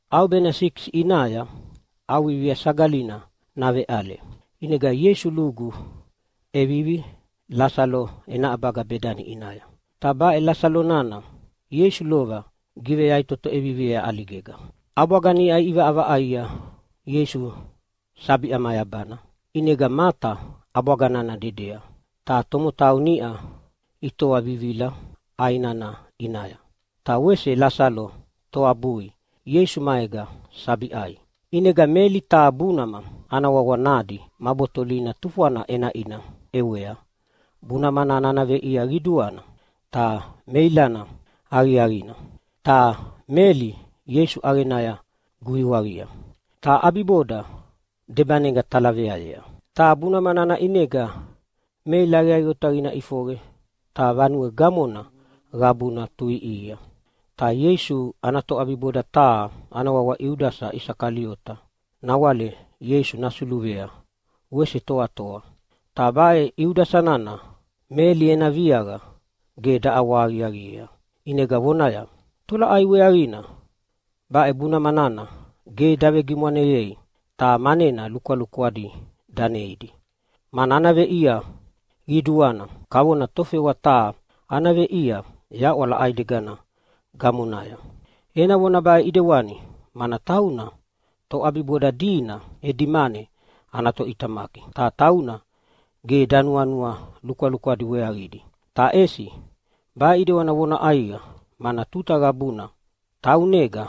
ʼAubena sikisi ʼinaya ʼAuvivia Sagalina naveʼale, ʼinega Ieisu lugu ʼevivi Lasalo ena ʼabaga Bedani ʼinaya. Ta baʼe Lasalo nana Ieisu lova giveyaʼitoto ʼeviviea ʼaligega. ʼAbwaga niʼa iʼivaʼavaʼaia Ieisu sabi ʼamayabana. ʼInega Mata ʼabwaga nana dedea, ta tomotau niʼa itoa vivilia ʼai nana ʼinaya, ta wese Lasalo toabui Ieisu maega sabi ʼai. ʼInega Meli taha bunama ana wawa nadi ma botolina tufwana ʼenaʼina ʼewea. Bunama nana ana veʼia qiduana ta meilana aqiaqina. Ta Meli Ieisu ʼaqenaya guiwaqia, ta ʼabiboda debanega talaveayea. Ta bunama nana ʼinega meila aqiaqi otaqina ʼifoqe, ta vanue gamona qabuna tuʼiʼihia. Ta Ieisu ana toʼabiboda taha ana wawa Iudasa Isakaliota nawale Ieisu nasuluvea wese toatoa, ta baʼe Iudasa nana Meli ena viaqa ge daʼawahaqiaqiea, ʼinega vonaya, “Tolaʼai weaqina baʼe bunama nana ge davegimwaneyei, ta manena lukwalukwadi daneidi? Mana ana veʼia qiduana, kavona tofewa taha ana veʼia yaʼwala ʼaidegana gamonaya.” Ena vona baʼe ʼedewani mana tauna toʼabiboda dina edi mane ana toʼitamaki. Ta tauna ge danuanua lukwalukwadi weaqidi, ta ʼesi baʼe ʼidewani vona ʼaiqa, mana tuta qabuna taunega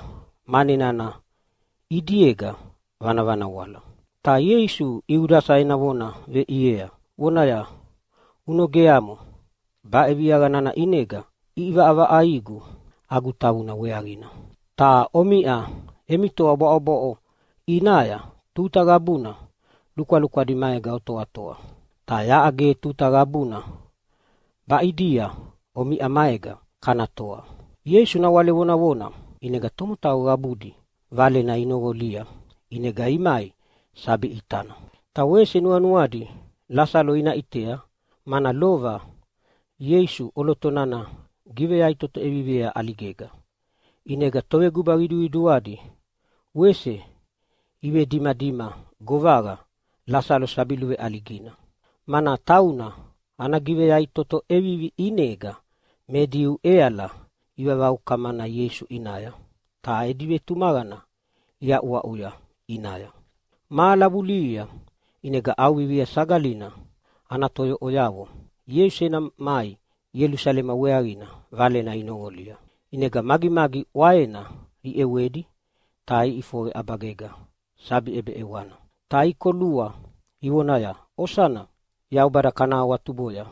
mane nana ʼidiega vanavanawala. Ta Ieisu Iudasa ena vona veʼiea vonaya, “Unogeamo! Baʼe viaqa nana ʼinega ʼivaʼavaʼaigu agu tavuna weaqina. Omiʼa emi toa bwaʼobwaʼo ʼinaya tuta qabuna lukwalukwadi maega otoatoa, ta yaʼa ge tuta qabuna baʼidia omiʼa maega kana toatoa.” Ieisu nawale vonavona ʼinega tomotau qabudi valena inoqolia ʼinega imai sabi ʼitana. Ta wese nuanuadi Lasalo ina ʼitea, mana lova Ieisu ʼoloto nana giveyaʼitoto ʼeviviea ʼaligega. ʼInega toveguba qiduqiduadi wese ivedimadima govaqa Lasalo sabi luveʼaligina, mana tauna ana giveyaʼitoto ʼevivi ʼinega me Diu ʼeala ivavaukamana Ieisu ʼinaya ta edi vetumaqana iaʼuaʼuya ʼinaya. Mahala vulihia ʼinega ʼAuvivia Sagalina ana toyoʼoyavo Ieisu ena mai Ielusalema weaqina valena inoqolia, ʼinega magimagi ʼwaena iʼewedi ta iʼifoqe ʼabagega sabi ʼebeʼewana, ta ikolua ivonaya, “Osana! Yaubada kana awatuboya!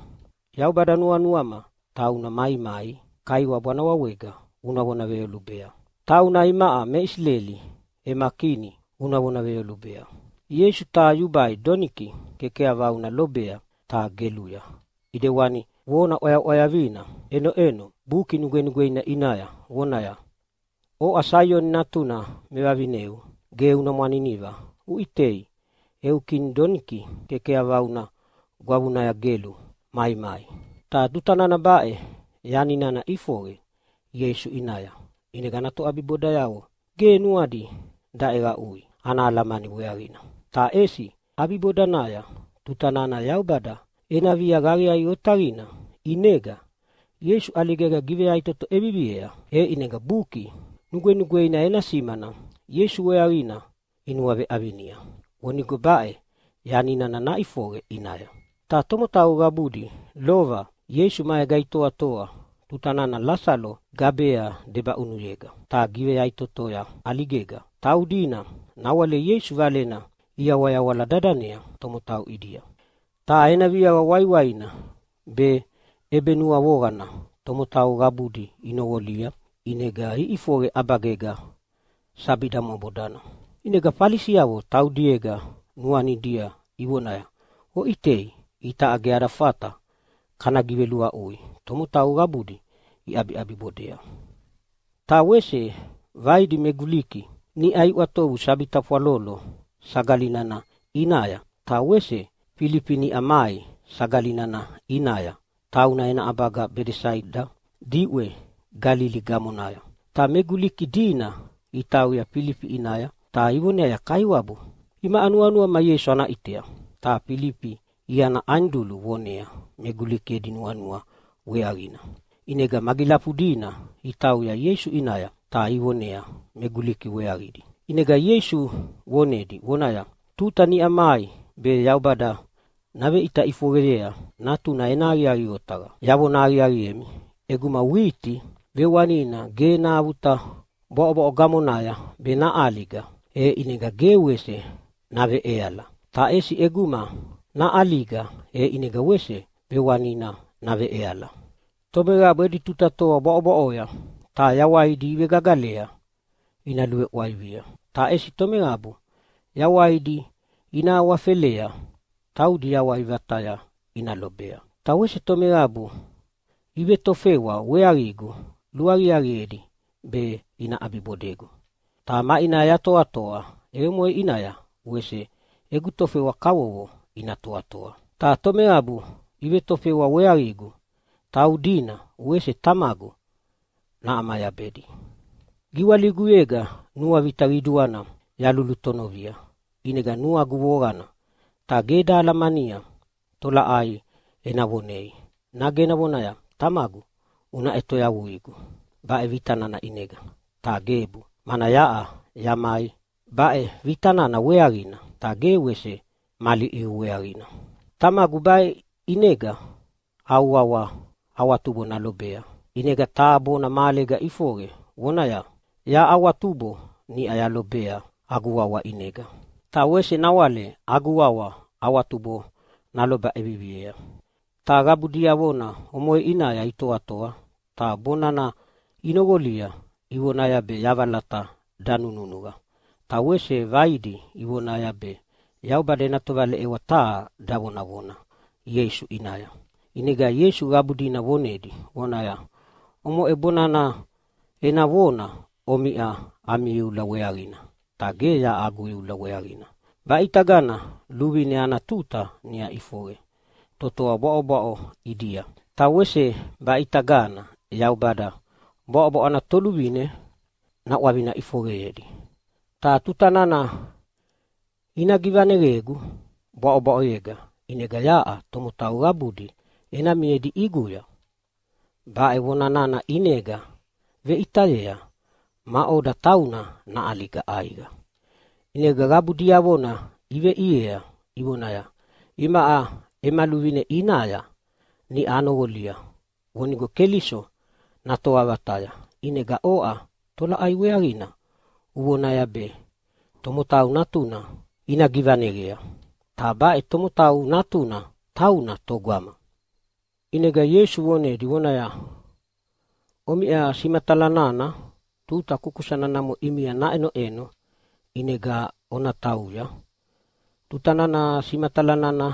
Yaubada, nuanuama tauna maimai Kaiwabu ana wawega una vona veyolubea. Tauna imaʼa me Isileli ema Kini una vona veyolubea!” Ieisu taha yubai doniki kekeyavauna lobea ta geluya, ʼidewani vona ʼwayaʼwayavina ʼenoʼeno Buki Nugwenugweina ʼinaya vonaya, “Oʼa Saioni natuna mevavineu, ge una mwaniniva, uʼitei, eu Kini doniki kekeyavauna gwavunaya gelu maimai.” Ta tuta nana baʼe yani nana ʼifoqe Ieisu ʼinaya, ʼinega ana toʼabibodayavo ge nuadi daʼeqaʼui ana alamani weaqina. Ta ʼesi ʼabibodanaya, tuta nana Yaubada ena viaqa aqiaqi otaqina ʼinega Ieisu ʼaligega giveyaʼitoto ʼeviviea, e ʼinega Buki Nugwenugweina ena simana Ieisu weaqina inuaveʼavinia vonigo baʼe yani nana naʼifoqe ʼinaya. Ta tomotau qabudi lova Ieisu maega itoatoa tuta nana Lasalo gabea debaʼunuyega ta giveyaʼitotoya ʼaligega, taudina nawale Ieisu Valena iyawayawala dadanea tomotau ʼidia. Ta ena viaqa waiwaina be ʼebenuavoqana tomotau qabudi inoqolia, ʼinega iʼifoqe ʼabagega sabi damwabodana. ʼInega Falisiavo taudiega nuanidia ivonaya, “Oʼitei, itaʼa ge ada fata kana giveluaʼui! Tomotau qabudi iʼabiʼabibodea!” Ta wese vaidi me Guliki niʼa iʼwatovu mai sabi tafwalolo sagali nana ʼinaya. Ta wese Filifi niʼa mai sagali nana ʼinaya, tauna ena ʼabaga Bedesaida diʼwe Galili gamonaya. Ta me Guliki dina itauya Filifi ʼinaya, ta ivoneaya, “Kaiwabu, imaʼa nuanuama Ieisu ana ʼitea.” Ta Filifi iana Anidulu vonea me Guliki edi nuanua weaqina. ʼInega magilafudina itauya Ieisu ʼinaya ta ivonea me Guliki weaqidi. ʼInega Ieisu vonedi vonaya, “Tuta niʼa mai be Yaubada naveʼita ʼifoqeyea Natuna ena aqiaqi otaqa. Yavona aqiaqiemi, ʼeguma witi vewanina ge nahavuta bwaʼobwaʼo gamonaya be naʼaliga, e ʼinega ge wese naveveʼeala. Ta ʼesi ʼeguma naʼaliga e ʼinega wese vewanina naveʼeala. Tomeqabu edi tuta toa bwaʼobwaʼoya ta yawaidi ivegagalea ina luveʼwaivia. Ta ʼesi tomeqabu yawaidi ina awafelea taudina yawai vataya ina lobea. Ta wese tomeqabu ivetofewa weaqigu luaqiaqiedi be ina ʼabibodegu, ta maʼinaya yatoatoa e omoʼe ʼinaya wese egu tofewa kavovo ina toatoa. Ta tomeqabu ivetofewa weaqigu taudina wese Tamagu naʼamayabedi. “Giwaliguyega nuavita qiduana yalulutonovia. ʼInega nuagu voqana ta ge eda alamania tolaʼai ena vonei. Nage ena vonaya, ‘Tamagu, una ʼetoyavuigu baʼe vita nana ʼinega.’ Ta gebu, mana yaʼa yamai baʼe vita nana weaqina, ta ge wese mali ʼiu weaqina. Tamagu, baʼe ʼinega au wawa awatubo nalobea.” ʼInega taha bona mahalega ʼifoqe, vonaya, “Yaʼa awatubo niʼa yalobea agu wawa ʼinega. Ta wese nawale agu wawa awatubo naloba ʼeviviea.” Ta qabu diavona omoʼe ʼinaya itoatoa ta bona nana inoqolia ivonaya be yavalata danununuqa, ta wese vaidi ivonaya be Yaubada ena tovaleʼewa taha davonavona Ieisu ʼinaya. ʼInega Ieisu qabu dina vonedi vonaya, “Omoʼe bona nana ena vona omiʼa ami iula weaqina, ta ge yaʼa agu iula weaqina. Baʼitagana luvine ana tuta niʼa ʼifoqe totoa bwaʼobwaʼo ʼidia. Ta wese baʼitagana Yaubada bwaʼobwaʼo ana toluvine naʼwavina ʼifoqeyea. Ta tuta nana ina givaneqegu bwaʼobwaʼoyega ʼinega yaʼa tomotau qabudi ena miedi ʼiguya.” Baʼe vona nana ʼinega veʼitayea maʼoda tauna naʼaliga ʼaiqa. ʼInega qabu diavona iveʼiea ivonaya, “Imaʼa ema luvine ʼinaya niʼa anoqolia vonigo Keliso natoa vataya, ʼinega oʼa tolaʼai weaqina uvonaya be Tomotau Natuna ina givaneqea? Ta baʼe Tomotau Natuna, tauna togama?” ʼInega Ieisu vonedi, vonaya, “Omiʼa simatala nana tuta kukusana namo ʼimia naʼenoʼeno, ʼinega ona tauya tuta nana simatala nana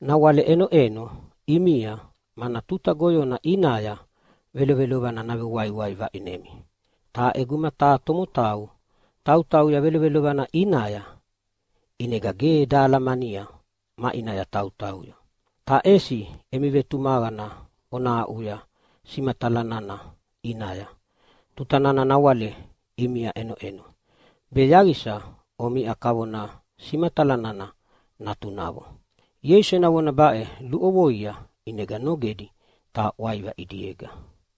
nawale ʼenoʼeno ʼimia, mana tuta goyona ʼinaya velovelovana navewaiwai vaʼinemi. Ta ʼeguma taha tomotau tautauya velovelovana ʼinaya, ʼinega ge dahalamania maʼinaya tautauya. Ta ʼesi emi vetumaqana ona aʼuya simatala nana ʼinaya tuta nana nawale ʼimia ʼenoʼeno, be yaqisa omiʼa kavona simatala nana natunavo.” Ieisu ena vona baʼe luʼovoia, ʼinega nogedi ta ʼwaiva ʼidiega.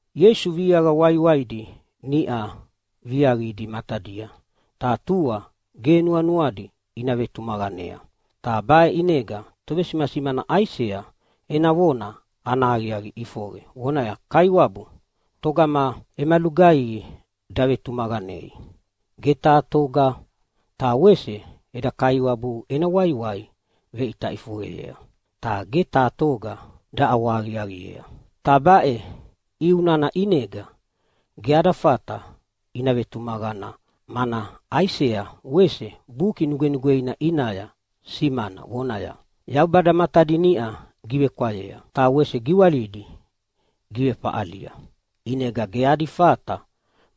Ieisu viaqa waiwaidi niʼa viaqidi matadia, ta tua ge nuanuadi ina vetumaqanea. Ta baʼe ʼinega tovesimasimana Aisea ena vona ana aqiaqi ʼifoqe, vonaya, “Kaiwabu, togama ema lugaihi davetumaqanei? Ge taha toga! Ta wese eda Kaiwabu ena waiwai veʼita ʼifoqeyea, ta ge taha toga daʼawahaqiaqiea.” Ta baʼe ʼiu nana ʼinega ge adi fata ina vetumaqana, mana Aisea wese Buki Nugwenugweina ʼinaya simana vonaya, “Yaubada matadi niʼa givekwayea ta wese giwalidi givefaʼalia, ʼinega ge adi fata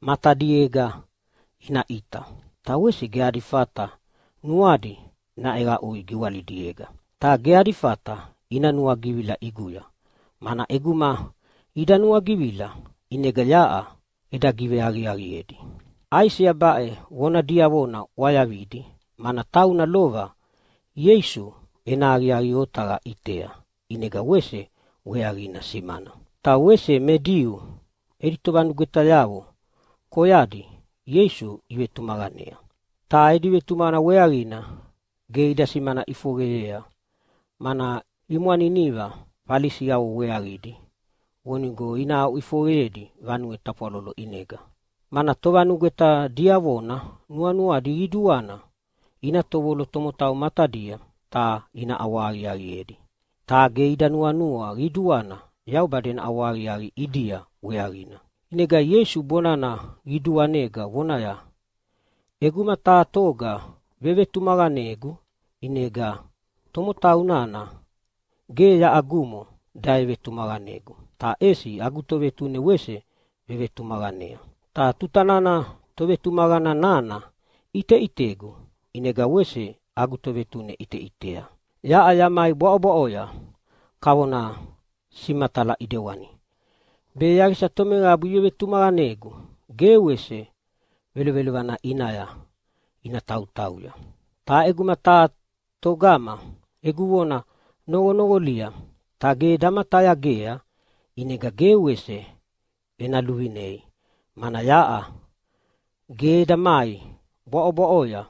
matadiega ina ʼita, ta wese ge adi fata nuadi naʼeqaʼui giwalidiega, ta ge adi fata ina nuagivila ʼiguya, mana ʼeguma ida nuagivila ʼinega yaʼa eda giveaqiaqiedi.” Aisea baʼe vona diavona ʼwayavidi, mana tauna lova Ieisu ena aqiaqi otaqa ʼitea ʼinega wese weaqina simana. Ta wese me Diu edi tovanugwetayavo koyadi Ieisu ivetumaqanea. Ta edi vetumaqana weaqina ge ida simana ʼifoqeyea, mana imwaniniva Falisi weaqidi vonigo ina aʼuʼifoqeyedi vanue tafwalolo ʼinega. Mana tovanugweta diavona nuanuadi qiduana ina tovolo tomotau matadia ta ina ʼawahaqiaqiedi, ta ge ida nuanua qiduana Yaubada ena ʼawahaqiaqi ʼidia weaqina. ʼInega Ieisu bonana qiduanega vonaya, “ʼEguma taha toga vevetumaqanegu, ʼinega tomotau nana ge yaʼagumo davevetumaqanegu, ta ʼesi agu Tovetune wese vevetumaqanea. Ta tuta nana tovetumaqana nana ʼiteʼitegu, ʼinega wese agu Tovetune ʼiteʼitea. Yaʼa yamai bwaʼobwaʼoya kavona simatala ʼidewani, be yaqisa tomeqabu ivevetumaqanegu ge wese velovelovana ʼinaya ina tautauya. “Ta ʼeguma taha toga egu vona noqonoqolia ta ge damatayagea, ʼinega ge wese ena luvinei, mana yaʼa ge eda mai bwaʼobwaʼoya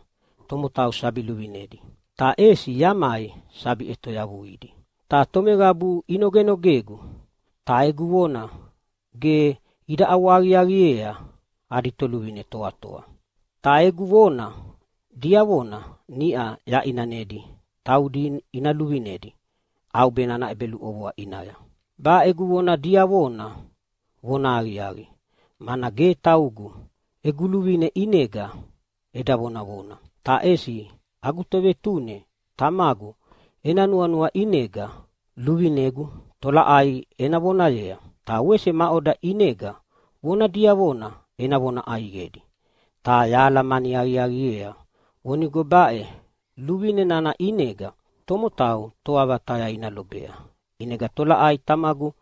tomotau sabi luvinedi, ta ʼesi yamai sabi ʼetoyavuidi. Ta tomeqabu inogenogegu ta egu vona ge ida ʼawahaqiaqiea adi toluvine toatoa. Ta egu vona diavona niʼa yaʼinanedi taudi ina luvinedi ʼaubena ana ʼebeluʼovoa ʼinaya. Baʼe egu vona diavona vonahaqiaqi, mana ge taugu egu luvine ʼinega eda vonavona, ta ʼesi agu Tovetune Tamagu ena nuanua ʼinega luvinegu tolaʼai ena vonayea ta wese maʼoda ʼinega vona diavona ena vona ʼaiqedi. Ta yahalamani aqiaqiea vonigo baʼe luvine nana ʼinega tomotau toa vataya ina lobea. ʼInega tolaʼai Tamagu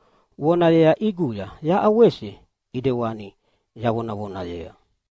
vonayea ʼiguya yaʼa wese ʼidewani yavonavonayea.”